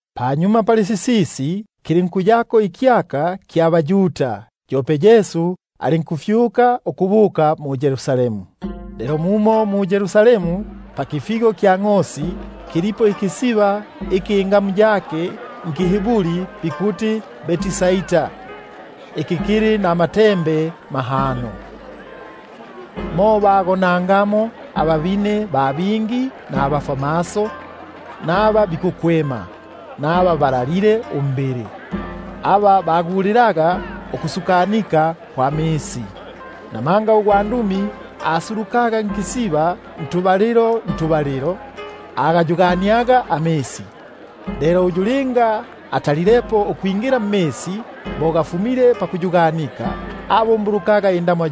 Panyuma pali sisisi, kilinkuyapo ikyaka kya baYuda, yope Yesu alinkufyuka ukubuka mu-Yerusalemu. Mumo mu-Yerusalemu, pakipata kya ngʼosi, kilipo ikisiba iki nki- Hiburi bikuti Betsaida, kili namatembe mahano. Mo bagonangamo ababine ba bingi, nabafwamaso, naba bikukwema, naba balalile umbili, [aba bagulilaga ukusukanika kwa misi. Namanga ugwandumi asulukaga nkisiba ntubalilo ntubalilo, alinkugayugania amisi; lelo uyu linga atalilepo ukwingila mmisi bo gafumile pakuyuganika, abumbulukaga indamwa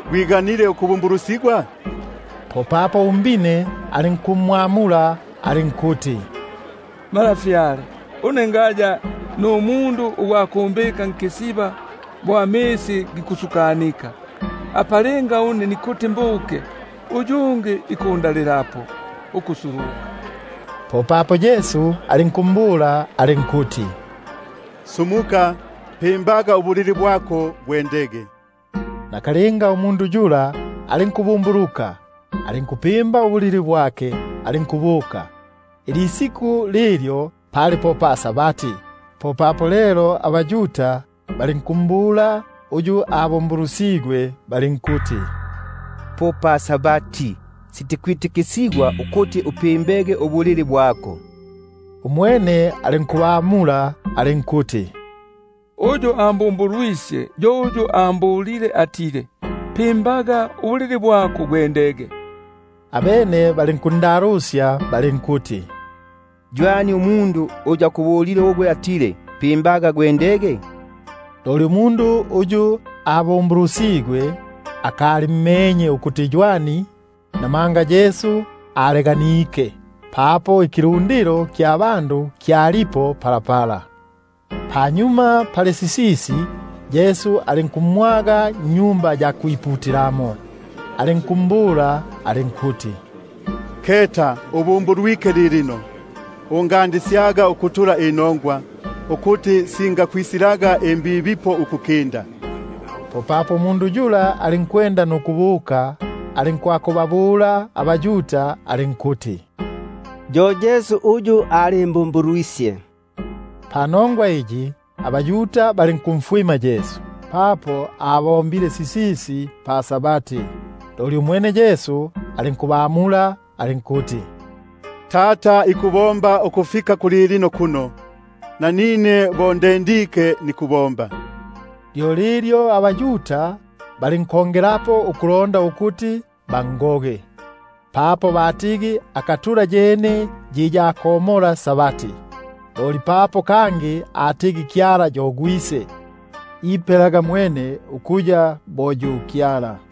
gwiganile ukubumbulusigwa? Popapo umbine alinkumwamula alinkuti: Malafyale, une ngaya numundu ugwa kumbika nkisiba bo amisi gikusukanika; apa linga nikuti mbuke une, uyungi ikundalilapo ukusuluka. Popapo Yesu alinkumbula alinkuti: Sumuka, pimbaga ubulili bwako, gwendege. Nakalinga umundu yula alinkubumbuluka, alinkupimba ubulili bwake, alinkubuka. Isiku lilyo pali po pa-Sabati. Popapo lelo abaYuda balinkumbula uyu abumbulusigwe balinkuti: Po pa-Sabati, sitikwitikisigwa ukuti upimbege ubulili bwako. Umwene alinkubamula alinkuti: Uyu ambumbulusyaga, yo ambulile atile: Pimbaga ubulili bwako, gwendege. Abene balinkundalusya balinkuti: Ywani umundu uyu akubulile atile, pimba gwendege? Loli umundu uyu abumbulusigwe, akalimmenye ukuti ywani, namanga Yesu aleganike, papo ikilu- ndilo kya bandu kyalipo papo. Panyuma pali sisisi, Yesu alinkumwaga mwa Tempeli, alinkumbula alinkuti: Keta, ubumbulwike lilino, ungatulaga inongwa kangi, ukuti singisa- kukwisilaga imbibipo ukukinda. Popapo umundu yula alinkubuka, alinkwakubabula abaYuda alinkuti: Yo Yesu uyu alimbumbulwisye. Panongwa iyi, abaYuda balinkumfwima Yesu, papo asibombile sisisi pa-Sabati. Umwene Yesu alinkubamula alinkuti: Tata ikubomba ukufika kulilino kuno, nanine nikubomba. Panongwa iyi, abaYuda balinkongelapo ukulonda ukuti bangoge, papo yikali yene yi ya komola Sabati, loli papo kangi atigi Kyala yo Tata; ipelaga mwene ukuya bo yu Kyala.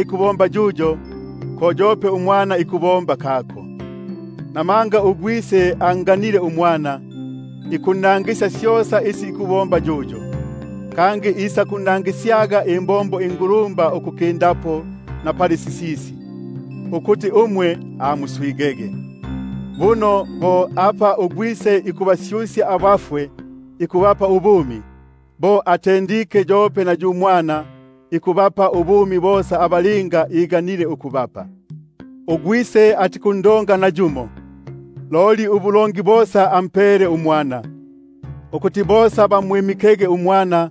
ikubomba yuyo, ko aka yope uMwana ikubomba. Namanga uGwise anganile uMwana, ikunnangisya syosa isi ikubomba yuyo; kangi isakunnangisyaga imbombo ingulumba ukuki- ndapo pali sisisi, ukuti umwe muswigege. Buno bo apa uGwise ikubasyusya abafwe nukubapa ubumi, mo mumo yope uMwana ikubapela ubumi aba iganile ukubapa. Buno uGwise atikundonga nayumo, loli ubulongi bosa ampele uMwana; ukuti bosa bamwimikege uMwana,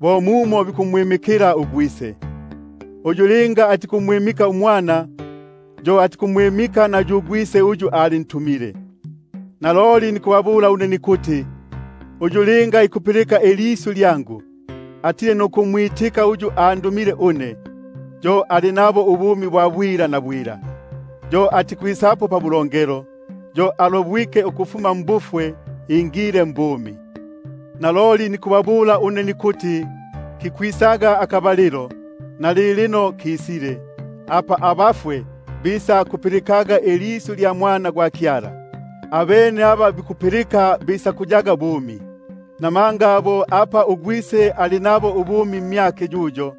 bo mumo bikumwimikila uGwise. Uyu linga atikumwimika uMwana, yo atikumwimika na yu Gwise uyu antumile. Naloliloli nikubabula une nikuti: Uyu linga ikupilika ilisyu lyangu, nukumwitika uyu andumile une, yo ali nabo ubumi bwa bwila; yo atikwisapo pabulongelo, yo alobwike ukufuma mbufwe abukile mbumi. Naloliloli nikubabula une nikuti: Kikwisaga akabalilo, nalilino kalipo, apa abafwe bisakupilikaga ilisyu lya Mwana gwa Kyala, abene aba bapilike bisakuyaga bumi. Namanga bo apa uGwise ali nabo ubumi mmyake yuyo,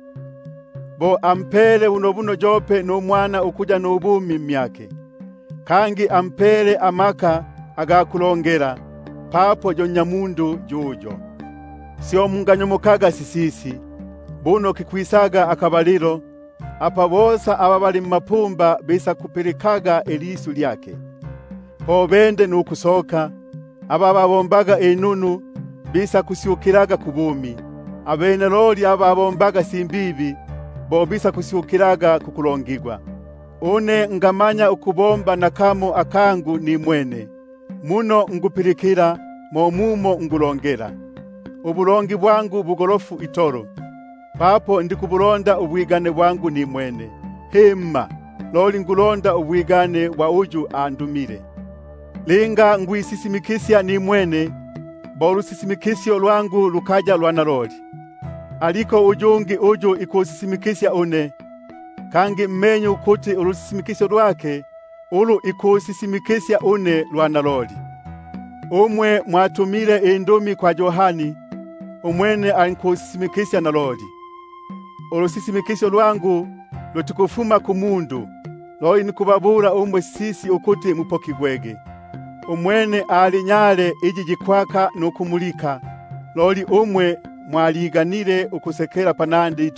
bunobuno ampele yope nuMwana ukuya nubumi mmyake. Kangi ampele amaka aga kulongela, papo yo Nnyamundu yuyo. Syo munganyomokaga sisisi, buno kikwisaga akabalilo, apa bosa aba bali mmapumba bisakulipilikaga ilisyu lyake, po bende nukusoka; aba babombaga inunu bisakusyukilaga kubumi, naba babombaga imbibi bisakusyukilaga kukulongigwa. Une ngamanya ukubomba nakamo nimwene, muno nikupilikila mo mumo nikulongela; nubulongi bwangu bugolofu itolo, papo ndikubulonda ubwigane bwangu nimwene, loli ubwa uyu andumile. Linga nikwisisimikisya nimwene, ulu- sisimikisyo lwangu lukaya lwa naloli. Aliko uyungi uyu ikusisimikisya une, kangi menye ukuti ulusisimikisyo lwake, ulu ikusisimikisya une lwa naloli. Umwe mwatumile indumi kwa Yohani, umwene alinkusisisimikisya isya naloli. Ulusisimikisyo lwangu lutikufuma kumundu, loli nikubabula umwe sisisi ukuti mupokigwege. Umwene ali nyale iyi yikwaka nukumulika; loli umwe mwaliganile ukusekelapo panandi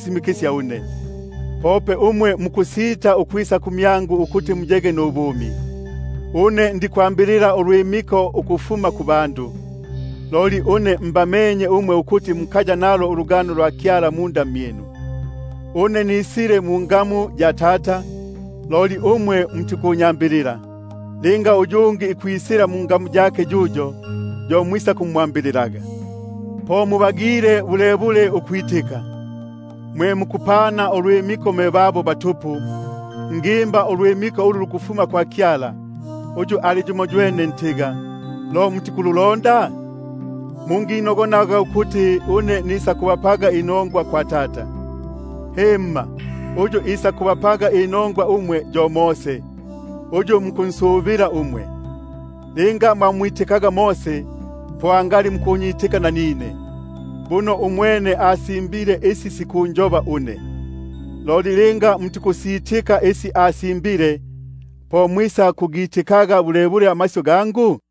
mikisya une. Pope umwe mukusita ukwisa kumyangu, ukuti muyege nubumi. Une ndikwambilila ulwimiko ukufuma kubandu, loli mbamenye ukuti mukaya nalo ulugano lwa Kyala nkati mmyinu. Une nisile mungamu ya Tata, loli umwe mutikunyambilila; linga uyungi ikwisila mungamu yake yuyo, yo mwisakumwambililaga. Po mubagile bulebule ukwitika, mwe mukupana ulwimiko mwe babo batupu, loli ulwimiko ulu lukufuma kwa Kyala, uyu ali yumoywene, lo mutikululonda? Munginogonaga ukuti une nisakubapaga inongwa kwa Tata, himma, uyu ikubapa inongwa umwe yo Mose, uyu mukunsubila umwe. Linga mwamwitikaga Mose, angali mukunyitika nanine, buno umwene asimbile isi siku- njoba une. Loli linga mutikusitika isi asimbile, po mwisakugitikaga bulebule amasyu gangu?